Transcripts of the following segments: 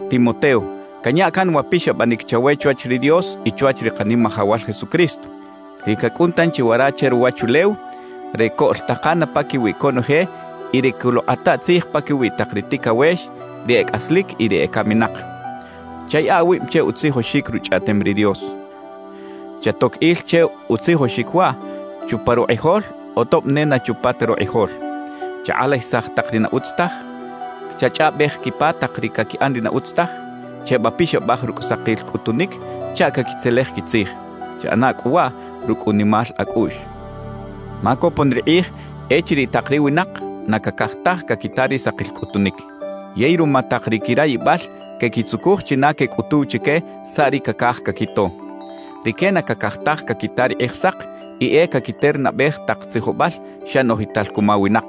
Timoteo, canya can wa pixabanic chawe chwach ri Dios y chwach ri Kanimajawal Jesucristo, ri cacꞌun tanchi wara che ruwachulew re coꞌltakana paquiwi conoje y re coluꞌkꞌata tzij paquiwi tak ri ticawex, ri e cꞌaslic y ri ecaminak. Chayaꞌa awib che utzijoxic Ruchꞌaꞌtem ri Dios. Chatoc il che utzijoxic waꞌ chupa rukꞌijol o tob ne na chupa ta rukꞌijol. Chakꞌalajisaj tak ri na utz taj, chachꞌaꞌbej quipa tak ri caquiꞌan ri na utz taj, chebapixabaj rucꞌ sakil cꞌutunic chaꞌ caquitzelej quitzij. Chaꞌana cꞌu waꞌ rucꞌ unimal acꞌuꞌx. Ma copon ri kꞌij echiriꞌ tak ri winak na cacaj taj caquita ri sakil cꞌutunic. Yey ruma tak ri quirayibal quequitzucuj china quecꞌutuw chique saꞌ ri cacaj caquito. Rique na cacaj taj caquita ri Kꞌijsak y e caquiternabej tak tzijobal xa noꞌjital cuma winak.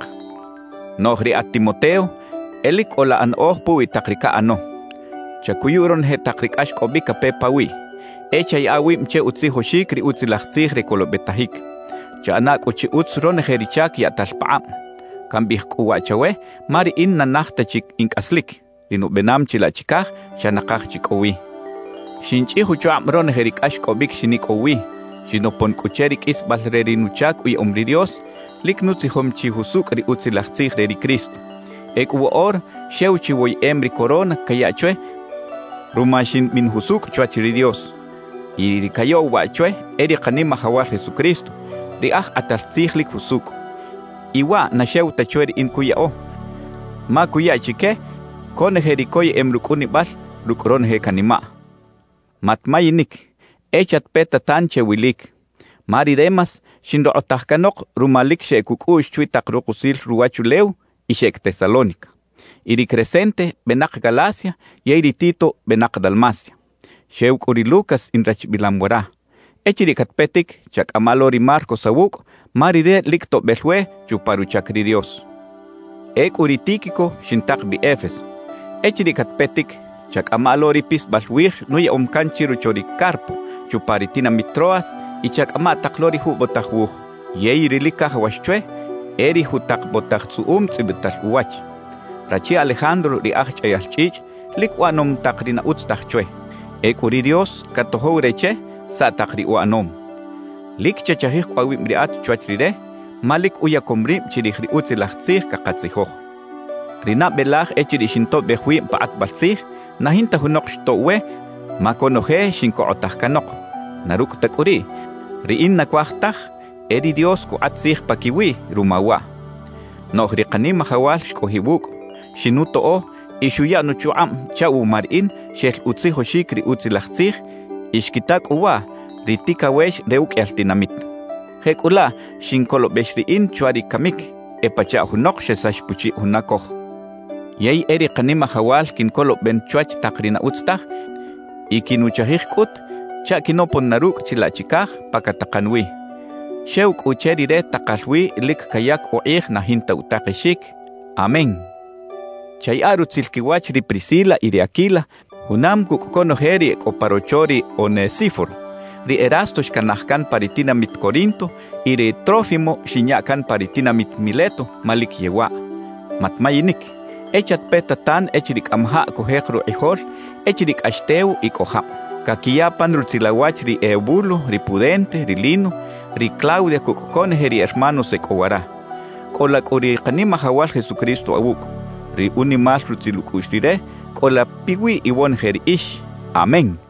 Noꞌj riꞌat Timoteo, e lic cꞌola anaꞌoj puwi tak ri caꞌano. Chacuyu ronoje tak ri cꞌaxcꞌobic cape pawiꞌ. E chayaꞌa awib che utzijoxic ri Utzilaj Tzij re colobetajic. Chaꞌana cꞌu chi utz ronoje ri chac yaꞌtal pakꞌab. Cambiꞌij cꞌu waꞌ chawe ma riꞌin na naj ta chi in cꞌaslic, ri nubenam chilaꞌ chicaj xa nakaj chi cꞌo wi. Xinchꞌij uchukꞌab ronoje ri cꞌaxcꞌobic xinicꞌow wi, xinopon cꞌu che ri qꞌuisbal re ri nuchac uyaꞌom ri Dios, lic nutzijom chi jusucꞌ ri Utzilaj Tzij re ri Cristo. Ecꞌu woꞌora xew chi woyeꞌem ri corona cayaꞌ chwe ruma ximbin jusucꞌ chwach ri Dios. Y ri cayaꞌw waꞌ chwe e ri Kanimajawal Jesucristo, ri Aj Kꞌatal Tzij lic jusucꞌ. Y waꞌ na xew ta chwe riꞌin cuyaꞌo, ma cuya chique conoje ri coyeꞌem rucꞌunibal rucꞌ ronoje canimaꞌ. Matmayinic, e chatpeta tan che wilic. Ma ri Demas xinrokꞌotaj canok ruma lic xeꞌec ucꞌuꞌx chwi tak rukusil ruwachulew y xeꞌec Tesalónica. Y ri Crescente benak Galacia yey ri Tito benak Dalmacia. Xew cꞌu ri Lucas inrachbilam wara. Echiriꞌ catpetic, chacꞌama lo ri Marcos awucꞌ ma rire lic toꞌbel we chupa ruchac ri Dios. Ecꞌu ri Tíquico xintak bi Éfeso. Echiriꞌ catpetic, chacꞌama lo ri pisbal wij nuyaꞌom can chirocho ri Carpo chupa ri tinamit Troas y chacꞌama tak lo ri jubotaj wuj; yey ri lic cajawax chwe e ri jutak botaj tzꞌuꞌum tzꞌibital uwach. Rachi Alejandro ri aj chꞌayal chꞌichꞌ lic uꞌanom tak ri na utz taj chwe. Ecꞌu ri Dios catojow re che saꞌ tak ri uꞌanom. Lic chachajij cꞌu awib riꞌat chwach rire ma lic uyacom rib chirij ri Utzilaj Tzij cakatzijoj. Ri nabe laj echiriꞌ xintoꞌbej wib pa kꞌatbal tzij, na jinta junok xtoꞌw we ma conoje xincokꞌotaj canok; na rucꞌ ta cꞌu riꞌ, riꞌin na cuaj taj e ri Dios cukꞌat tzij paquiwiꞌ ruma waꞌ. Noꞌj ri Kanimajawal xcꞌojiꞌ wucꞌ, xinutoꞌo y xuya nuchukꞌab chaꞌ wuma riꞌin xel utzijoxic ri Utzilaj Tzij y xquita cꞌu waꞌ ri ticawex re uqꞌuiyal tinamit. Jecꞌulaꞌ xincolobex riꞌin chwa ri camic, e pachaꞌ junok xesax puchiꞌ juna coj. Yey e ri Kanimajawal quincoloben chwach tak ri na utz taj y quinuchajij cꞌut chaꞌ quinopon na rucꞌ chilaꞌ chicaj pa catakan wi. Xew cꞌu che Rire takal wi lic cayac ukꞌij na jinta utakexic. Amén. Chayaꞌa rutzil quiwach ri Priscila y ri Aquila junam cucꞌ conoje ri e cꞌo pa rocho ri Onesíforo. Ri Erasto xcanaj can pa ri tinamit Corinto y ri Trófimo xinya can pa ri tinamit Mileto ma lic yewaꞌ. Matmayinic, e chatpeta tan echiriꞌ cꞌamajaꞌ cujek rukꞌijol echiriꞌ cꞌax tew y cꞌo jab. Caquiya pan rutzil awach ri Eubulo, ri Pudente, ri Lino, ri Claudia cucꞌ conoje ri hermanos e cꞌo wara. Cꞌola cꞌu ri Kanimajawal Jesucristo awucꞌ. Ri unimal rutzil ucꞌuꞌx Rire cꞌola piwiꞌ iwonoje riꞌix. Amén.